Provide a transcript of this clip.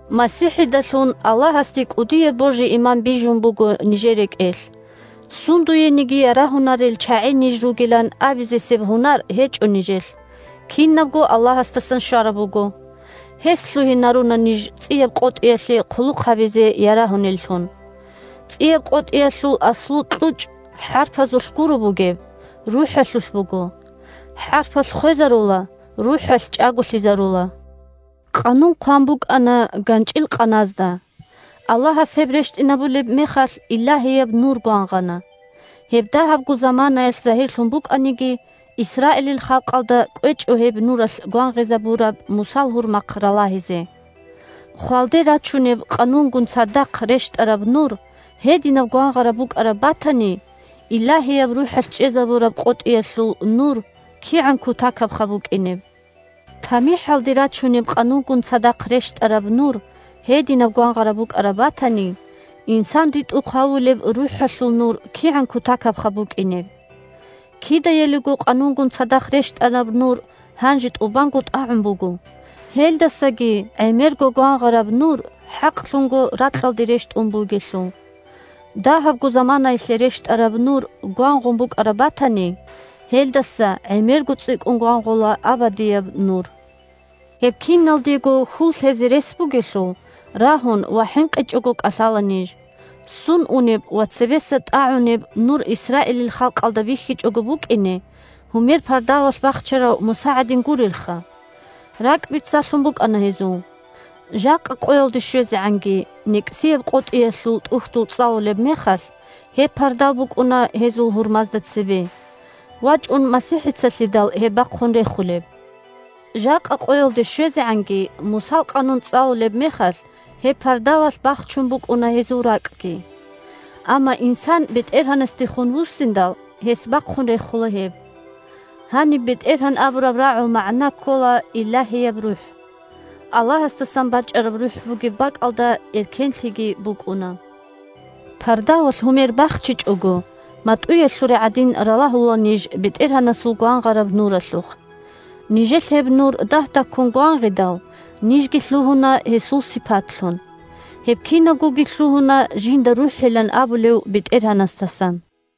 МасихӀидалъун Аллагьасде кӀудияб божи-иман бижун буго нижер рекӀелъ. Сундуениги ярагьунел чагӀи ниж ругилан абизесеб гьунар гьечӀо нижелъ, кинабго Аллагьасдасан щвараб буго. Гьес лъугьинаруна ниж ЦӀияб къотӀиялъе хъулухъ гьабизе ярагьунеллъун. ЦӀияб къотӀиялъул аслу-кьучӀ хӀарпазулъ гуро бугеб, РухӀалъулъ буго. ХӀарпалъ хвезарула, РухӀалъ чӀаголъизарула! Къанун хъван букӀана ганчӀил къаназда. Аллагьас гьеб рещтӀинабулеб мехалъ илагьияб Нур гвангъана, гьеб дагьабго заманаялъ загьирлъун букӀаниги, Исраилил халкъалда кӀвечӀо гьеб Нуралъ гвангъизабураб Мусал гьурмахъ ралагьизе. Хвалде рачунеб Къанунгун цадахъ рещтӀараб Нур гьединаб гвангъараб букӀараб батани, Илагьияб РухӀалъ чӀезабураб къотӀиялъул Нур кигӀан кутакабха букӀинеб? ТамихӀалде рачунеб Къанунгун цадахъ рещтӀараб Нур гьединаб гвангъараб букӀараб батани, инсан ритӀухъ гьавулеб РухӀалъул Нур кигӀан кутакабха букӀинеб? Кидаялиго Къанунгун цадахъ рещтӀараб Нур гьанже тӀубанго тӀагӀун буго, гьелдасаги гӀемерго гвангъараб Нур хӀакълъунго ракьалде рещтӀун бугелъул! Дагьабго заманаялъе рещтӀараб Нур гвангъун букӀараб батани, гьелдаса гӀемерго цӀикӀкӀун гвангъула абадияб Нур. Гьеб киналдего хьул лъезе рес бугелъул, рагьун ва хӀинкъичӀого кӀалъала ниж. Ссун унеб ва цебеса тӀагӀунеб Нур Исраилил халкъалда бихьичӀого букӀине гьумер пардавалъ бахчарав Муса гӀадин гурелха. РакӀбицалъун букӀана гьезул. Жакъа къоялде щвезегӀанги, НекӀсияб къотӀиялъул ТӀухьдул цӀалулеб мехалъ, гьеб пардав букӀуна гьезул гьурмазда цебе. ВачӀун МасихӀицалъидал гьеб бахъун рехулеб. Жакъа къоялде щвезегӀанги, Мусал Къанун цӀалулеб мехалъ, гьеб пардавалъ бахчун букӀуна гьезул ракӀги. Амма инсан БетӀергьанасдехун вуссиндал, гьес бахъун рехула гьеб. Гьаниб БетӀергьан абураб рагӀул магӀна ккола Илагьияб РухӀ. Аллагьасдасан бачӀараб РухӀ бугеб бакӀалда эркенлъиги букӀуна! Пардавалъ гьумер бахчичӀого, матӀуялъуре гӀадин, ралагьула ниж БетӀергьанасул гвангъараб Нуралъухъ. Нижелъ гьеб Нур дагь-дагьккун гвангъидал, нижги лъугьуна гьесул сипатлъун. Гьеб кинабгоги лъугьуна жинда РухӀилан абулев БетӀергьанасдасан.